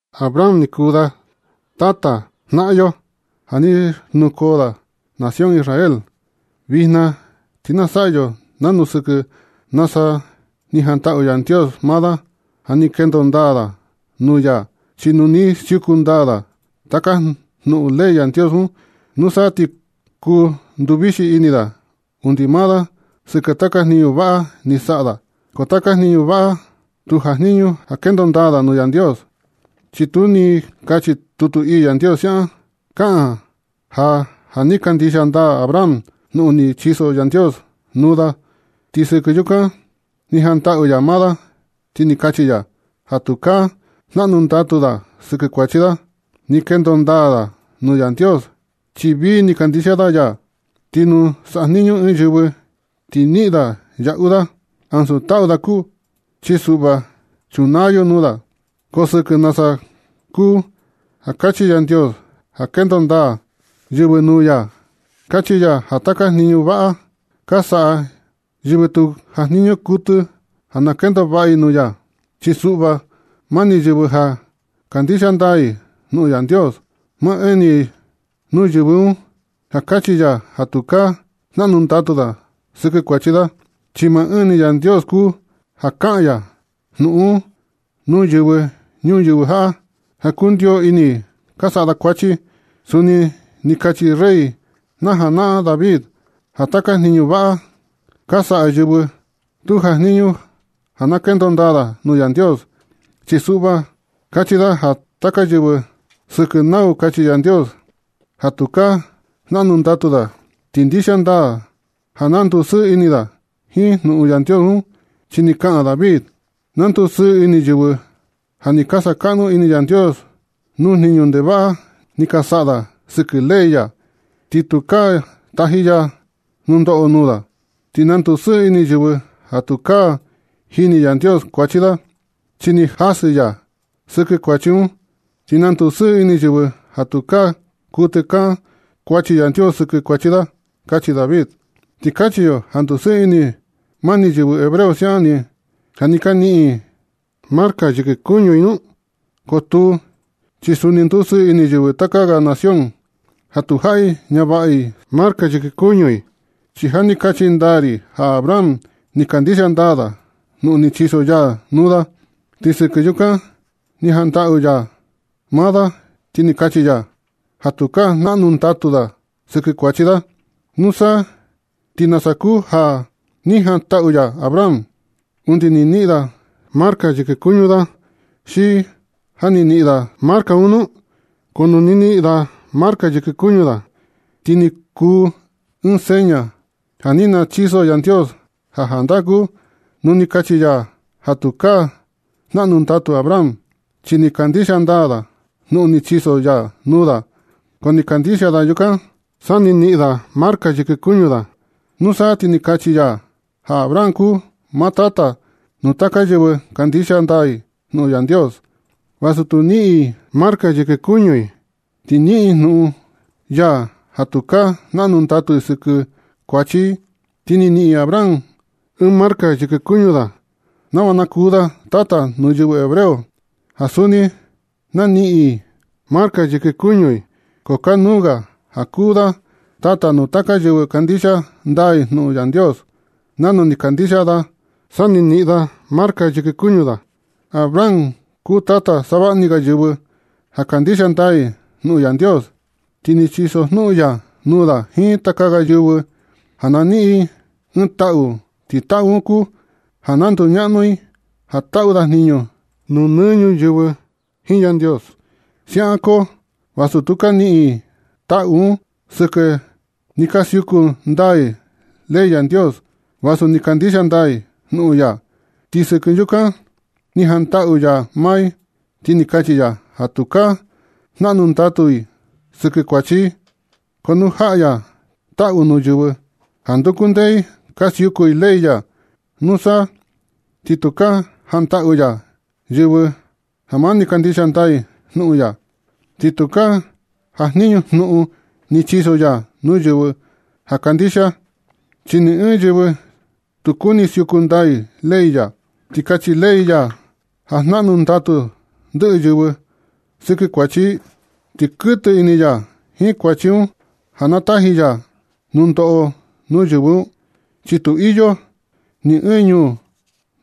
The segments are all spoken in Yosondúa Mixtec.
Abraham ni kuu da tata na janaꞌan yo ja ni xnukoo da nación Israel. Vijna ti na saꞌa yo nanu sɨkɨ nasa ni jantaꞌu Yandios maa da ja ni kendo ndaa da nuu ya. Chi nu ni siuku ndaa da taka jnuꞌun ley Yandios un, nusa ti kuu nduvixi ini da undi maa da sɨkɨ taka jniñu vaꞌa ni saꞌa da. Ko taka jniñu vaꞌa un tu jajniñu ja na kendo ndaa da nuu Yandios. Chi tu ni kachi tutu ii Yandios siaꞌan. Kaꞌan ja ja ni kandixia ndaa Abraham jnuꞌun ni chiso Yandios nuu da, ti sɨkɨ yukan ni jantaꞌu ya maa da, ti ni kachi ya ja tukaa jnaꞌnu ndatu da sɨkɨ kuachi da. Ni kendo ndaa da nuu Yandios chi vii ni kandixia da ya. Ti nu sajniñu ɨɨn yɨvɨ, ti niꞌin da yaꞌu da, ansu taꞌu da kuu, chi suꞌva chunaa yo nuu da. Ko sɨkɨ nasa kuu ja kachi Yandios ja kendo ndaa yɨvɨ nuu ya, kachi ya ja taka jniñu vaꞌa ka saꞌa yɨvɨ tu jajniñu kuɨtɨ ja na kendo vaꞌa i nuu ya. Chi suꞌva mani yɨvɨ ja kandixia ndaa i jnuꞌun Yandios, maa ɨɨn ni nuu yɨvɨ un ja kachi ya ja tukaa jnaꞌnu ndatu da sɨkɨ kuachi da. Chi maa ɨɨn ni Yandios kuu ja kaꞌan ya jnuꞌun un nuu yɨvɨ ñuyɨvɨ jaꞌa, ja kundio ini ka saꞌa da kuachi. Suni ni kachi rey na janaꞌan David ja taka jniñu vaꞌa ka saꞌa yɨvɨ tu jajniñu ja na kendo ndaa da nuu Yandios. Chi suꞌva kachi da ja taka yɨvɨ sɨkɨ nau kachi Yandios ja tukaa jnaꞌnu ndatu da, ti ndixia ndaa ja na ndusɨɨ ini da jiin jnuꞌun Yandios un. Chi ni kaꞌan David: Na ndusɨɨ ini yɨvɨ ja ni sakaꞌnu ini Yandios nuu jniñu ndevaꞌa ni saꞌa da sɨkɨ ley ya, ti tukaa taji ya nundoꞌo nuu da. Ti na ndusɨɨ ini yɨvɨ ja tukaa jini Yandios kuachi da, chi ni jasɨ ya sɨkɨ kuachi un. Ti na ndusɨɨ ini yɨvɨ ja tukaa kuɨtɨ kan kuachi Yandios sɨkɨ kuachi da. Kachi David. ¿Ti kachi yo ja ndusɨɨ ini mani yɨvɨ hebreo siaꞌan ni, ja ni ka niꞌin i marca yɨkɨ kuñu i nu? Ko tuu, chi suni ndusɨɨ ini yɨvɨ taka ga nación, ja tu jaꞌi ñavaꞌa i marca yɨkɨ kuñu i. Chi ja ni kachi ndaa ri ja Abraham ni kandixia ndaa da jnuꞌun ni chiso ya nuu da. Ti sɨkɨ yukan ni jantaꞌu ya maa da, ti ni kachi ya ja tukaa jnaꞌnu ndatu da sɨkɨ kuachi da. ¿Nusa, ti nasa kuu ja ni jantaꞌu ya Abraham? ¿Undi ni niꞌin da marca yɨkɨ kuñu da, xi ja ni niꞌin da marca un nu? Ko nu ni niꞌin da marca yɨkɨ kuñu da, ti ni kuu ɨɨn seña ja ni nachiso Yandios ja jandaa kuu nu ni kachi ya ja tukaa jnaꞌnu ndatu Abraham, chi ni kandixia ndaa da jnuꞌun ni chiso ya nuu da. Ko ni kandixia da yukan sa ni niꞌin da marca yɨkɨ kuñu da. Nusa ti ni kachi ya ja Abraham kuu maa tata nuu taka yɨvɨ kandixia ndaa i jnuꞌun Yandios, vasu tu niꞌin i marca yɨkɨ kuñu i, ti niꞌin i jnuꞌun ya ja tukaa jnaꞌnu ndatu i sɨkɨ kuachi i. Ti ni niꞌin Abraham ɨɨn marca yɨkɨ kuñu da nava na kuu da tata nuu yɨvɨ hebreo ja suni na niꞌin i marca yɨkɨ kuñu i. Ko kanuu ga ja kuu da tata nuu taka yɨvɨ kandixia ndaa i jnuꞌun Yandios nanu ni kandixia da sa ni niꞌin da marca yɨkɨ kuñu da. Abraham kuu tata savaꞌa ni ga yɨvɨ ja kandixia ndaa i jnuꞌun Yandios, ti ni chisojnuꞌun ya nuu da jiin taka ga yɨvɨ un ja na niꞌin i ɨɨn taꞌu, ti taꞌu un kuu ja na nduñaꞌnu i ja taꞌu da jniñu nuu nɨ ñuyɨvɨ jiin Yandios. Siaꞌan koo vasu tu ka niꞌin i taꞌu un sɨkɨ ni ka siuku ndaa i ley Yandios, vasu ni kandixia ndaa i jnuꞌun ya. Ti sɨkɨ yukan ni jantaꞌu ya maa i, ti ni kachi ya ja tukaa jnaꞌnu ndatu i sɨkɨ kuachi i. Ko nu jaꞌa ya taꞌu nuu yɨvɨ ja nduku ndee i ka siuku i ley ya, nusa ti tukaa jantaꞌu ya yɨvɨ ja mani kandixia ndaa i jnuꞌun ya. Ti tukaa jajniñu jnuꞌun ni nachiso ya nuu yɨvɨ ja kandixia, chi ni ɨɨn yɨvɨ tu kuni siuku ndaa i ley ya. Ti kachi ley ya ja jnaꞌnu ndatu ndɨꞌɨ yɨvɨ sɨkɨ kuachi i, ti kuɨtɨ ini ya jiin kuachi un ja na taji ya nundoꞌo nuu yɨvɨ un, chi tu iyo ni ɨɨn ñuu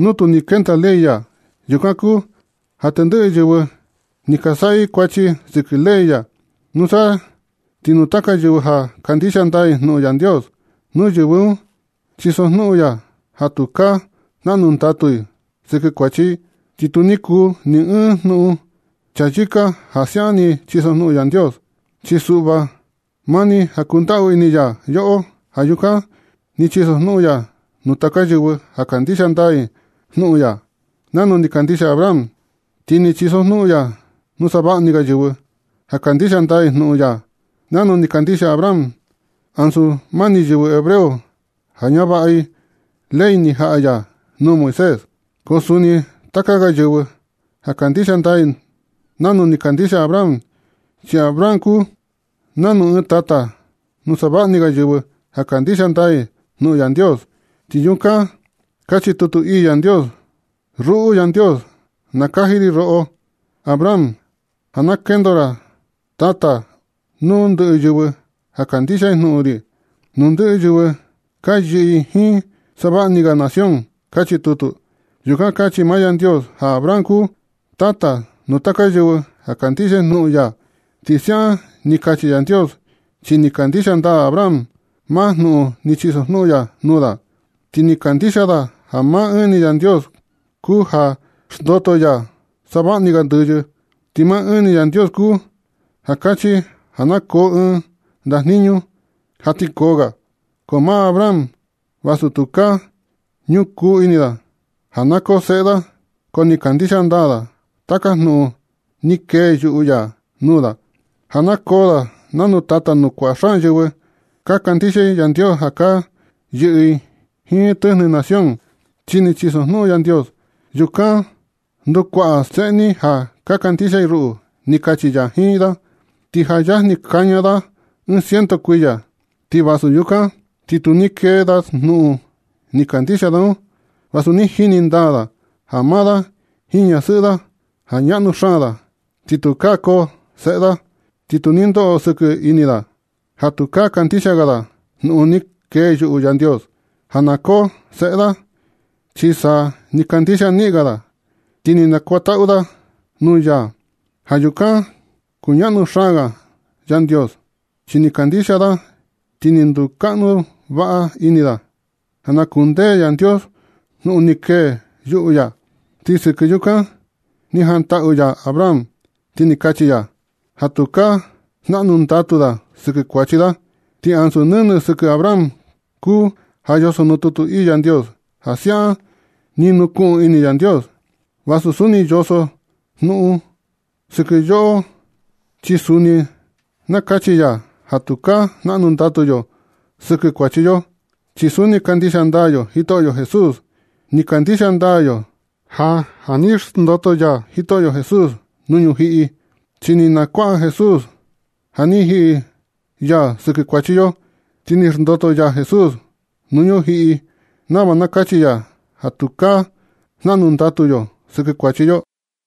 nuu tu ni kenda ley ya. Yukan kuu ja tendɨꞌɨ yɨvɨ ni ka saꞌa i kuachi sɨkɨ ley ya. Nusa ti nuu taka yɨvɨ ja kandixia ndaa i jnuꞌun Yandios, nuu yɨvɨ un chisojnuꞌun ya ja tukaa jnaꞌnu ndatu i sɨkɨ kuachi i. Ti tu ni kuu ni ɨɨn jnuꞌun chayɨka ja siaꞌan ni chisojnuꞌun Yandios. Chi suꞌva, mani ja kundaꞌu ini ya yoꞌo. Ja yukan ni chisojnuꞌun ya nuu taka yɨvɨ ja kandixia ndaa i jnuꞌun ya nanu ni kandixia Abraham. Ti ni chisojnuꞌun ya nuu savaꞌa ni ga yɨvɨ ja kandixia ndaa i jnuꞌun ya nanu ni kandixia Abraham, ansu mani yɨvɨ hebreo ja ñavaꞌa i ley ni jaꞌa ya nuu Moisés, ko suni taka ga yɨvɨ ja kandixia ndaa i nanu ni kandixia Abraham. Chi Abraham kuu nanu ɨɨn tata nuu savaꞌa ni ga yɨvɨ ja kandixia ndaa i jnuꞌun Yandios. Ti yukan kachi tutu ii Yandios: “Ruꞌu Yandios, nakaji ri roꞌo Abraham ja na kendo ra tata nuu ndɨꞌɨ yɨvɨ ja kandixia i jnuꞌun ri, nuu ndɨꞌɨ yɨvɨ ka yɨꞌɨ i jiin savaꞌa ni ga nación”, kachi tutu. Yukan kachi maa Yandios ja Abraham kuu tata nuu taka yɨvɨ ja kandixia i jnuꞌun ya. Ti siaꞌan ni kachi Yandios chi ni kandixia ndaa Abraham maa jnuꞌun ni chisojnuꞌun ya nuu da. Ti ni kandixia da ja maa ɨɨn ni Yandios kuu ja xndoto ya savaꞌa ni ga ndɨyɨ. Ti maa ɨɨn ni Yandios kuu ja kachi ja na koo ɨɨn ndajniñu ja ti koo ga. Ti maa Abraham, vasu tukaa ñukuu ini da ja na koo seꞌe da, ko ni kandixia ndaa da taka jnuꞌun ni kee yuꞌu ya nuu da, ja na koo da nanu tata nuu kua xaan yɨvɨ ka kandixia i Yandios ja ka yɨꞌɨ i jiin tɨjnɨ nación, chi ni chisojnuꞌun Yandios: “Yukan ndukuaꞌa seꞌe ni ja kandixia i ruꞌu”, ni kachi ya jiin da. Ti ja yajni kaña da ciento kuiya. Ti vasu yukan ti tu ni kee da jnuꞌun ni kandixia da un, vasu ni jini ndaa da ja maa da jiin ñasɨꞌɨ da ja ñaꞌnu xaan da ja tukaa koo seꞌe da. Ti tu ni ndoꞌo sɨkɨ ini da ja tukaa kandixia ga da jnuꞌun ni kee yuꞌu Yandios, ja na koo seꞌe da. Chi sa ni kandixia niꞌin ga da, ti ni nakuantaꞌu da nuu ya ja yukan kuñaꞌnu xaan ga Yandios. Chi ni kandixia da ti ni ndukaꞌnu vaꞌa ini da ja na kundee Yandios jnuꞌun ni kee yuꞌu ya. Ti sɨkɨ yukan ni jantaꞌu ya Abraham, ti ni kachi ya ja tukaa jnaꞌnu ndatu da sɨkɨ kuachi da. Ti ansu nɨnɨ sɨkɨ Abraham kuu ja yoso nuu tutu ii Yandios ja siaꞌan ni nukuꞌun ini Yandios, vasu suni yoso jnuꞌun un sɨkɨ yoꞌo, chi suni na kachi ya ja tukaa jnaꞌnu ndatu yo sɨkɨ kuachi yo, chi suni kandixia ndaa yo Jitoꞌyo Jesús. Ni kandixia ndaa yo ja ja ni xndoto ya Jitoꞌyo Jesús nuu ñujiꞌi. Chi ni nakuaꞌa Jesús ja ni jiꞌi ya sɨkɨ kuachi yo, ti ni xndoto ya Jesús nuu ñujiꞌi nava na kachi ya ja tukaa jnaꞌnu ndatu yo sɨkɨ kuachi yo.